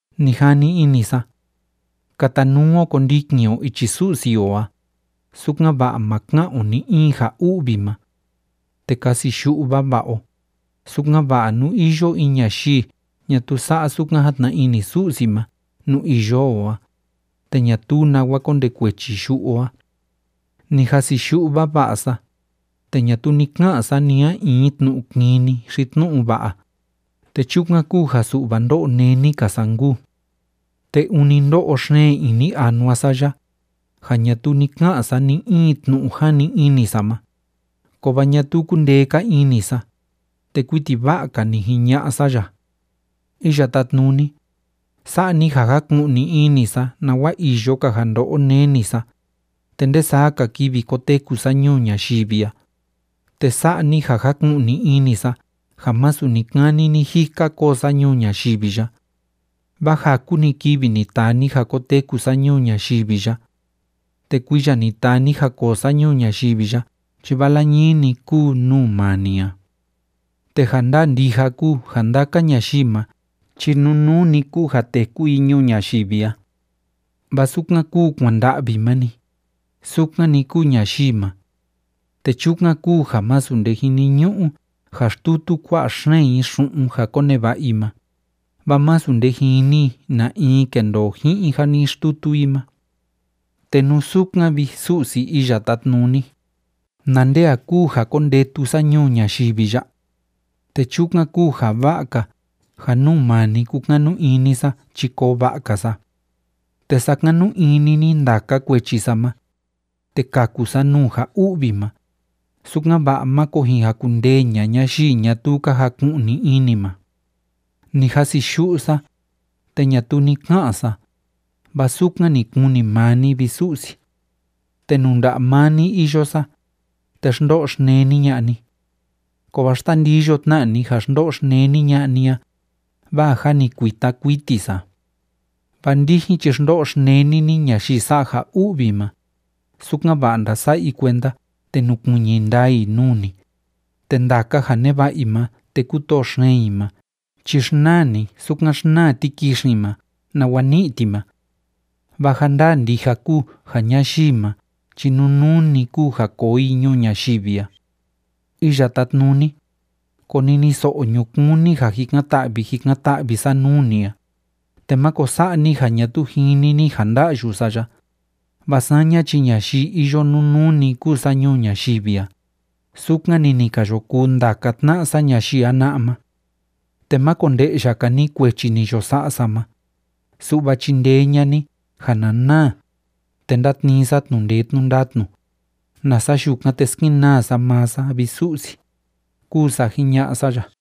Ni jani ini sa: Katanuu o kondikin o ichi Su'si o a, sukan‑va'a ma ka'an o ni‑in ja u'vi ma. Te kasiyu'u vava'a o, sukan‑va'a nú iyo in ñayii ñatuu sa'a sukan játna ini Su'si ma nuu iyo o a, te ñatuu nawa kondekuechi yu'u o a. Ni jasiyu'u vava'a sa, te ñatuu ni ka'an sa ni a in tnu'u kini xi tnu'u va'a, te chukan kúu ja su'va ndó'o néni‑ka sa nkuu. Te ûni ndó'o xeen ini anua sa ya, ja ñatuu ni ka'an sa ni‑in tnu'u jani ini sa ma, kovaa ñatuu kúndee‑ka ini sa, te kuiti va'a‑ka ni jiña'a sa ya: “Iya Tátnuni, sa'a ni ja jaku'ni ini sa nawa iyo‑ka ja ndo'o neni sa, te nde saa‑ka kivi koteku sa ñuu ñayivi a, te sa'a ni ja jaku'ni ini sa ja másu ni‑kani ni‑jika koo sa ñuu ñayivi ya. Vaa jaku‑ni kivi ni taa ni ja koteku sa ñuu ñayivi ya. Te kuiya ni taa ni ja koo sa ñuu ñayivi ya chi vala ñii‑ni kúu nuu maa ni a. Te ja ndaa ndija kúu ja ndaka ñayii ma chi nunuu‑ni kúu ja téku i ñuu ñayivi a. Vaa sukan kúu kuanda'vi ma‑ni, sukan‑ni kúu ñayii ma. Te chukan kúu ja másu nde jiniñu'u ja xtutu kua'a xeen i xu'un ja koneva'a i ma, vaa masu nde jini i na in kendoo ji'in ja ni xtutu i ma. Te nú sukan, vi Su'si Iya Tátnuni, ¿na nde a kúu ja kondetu sa ñuu ñayivi ya? Te chukan kúu ja va'a‑ka ja nuu maa ni kúkanu ini sa chi koo va'a‑ka sa. Te sakanu ini ni ndaka kuechi sa ma, te kaku sa nuu ja u'vi ma, sukan‑va'a máko jin jakundee ña'a ñayii ñatuu ka jaku'ni ini ma. ’Ni jasiyu'u sa, te ñatuu ni ka'an sa, vaa sukan ni kuni maa ni, vi Su'si. Te nuu nda'a maa ni iyo sa, te xndo'o xneni ña'a ni. Kovaa xtandiyo tna ni ja xndo'o xneni ña'a ni a, vaa jâ ni kuita kuiti sa. Vaa ndijin chi xndo'o xneni ni ñayii sa'a ja u'vi ma, sukan‑va'a ndasa'a i kuenda te nukuiñi ndaa i nuu ni. Te ndaka ja neva'a i ma te kútoo xeen i ma chi xnaa ni sukan xnaa tikixin ma nawa ní'i ti ma. Vaa ja ndaa ndija kúu ja ñayii ma chi nunuu‑ni kúu ja koo i ñuu ñayivi a. ’Iya Tátnuni, koniniso'o ñukuun ni ja jikan‑ta'vi jikan‑ta'vi sa nuu ni a, te máko sa'a ni ja ñatuu jini ni ja ndá'yu sa ya, vaa saña chi ñayii iyo nunuu‑ni kúu sa ñuu ñayivi a, sukan‑ni ni ka yo kuu ndaka tna'a sa ñayii jana'a ma. Te má konde'ya‑ka ni kuechi ni yo sa'a sa ma, su'va chindee ña'a ni ja na naa, te ndátnii sa tnu'u ndee tnu'u ndatnu, nasa yukan, te skenaa sa maa sa, vi Su'si”, kuu sa jiña'a sa ya.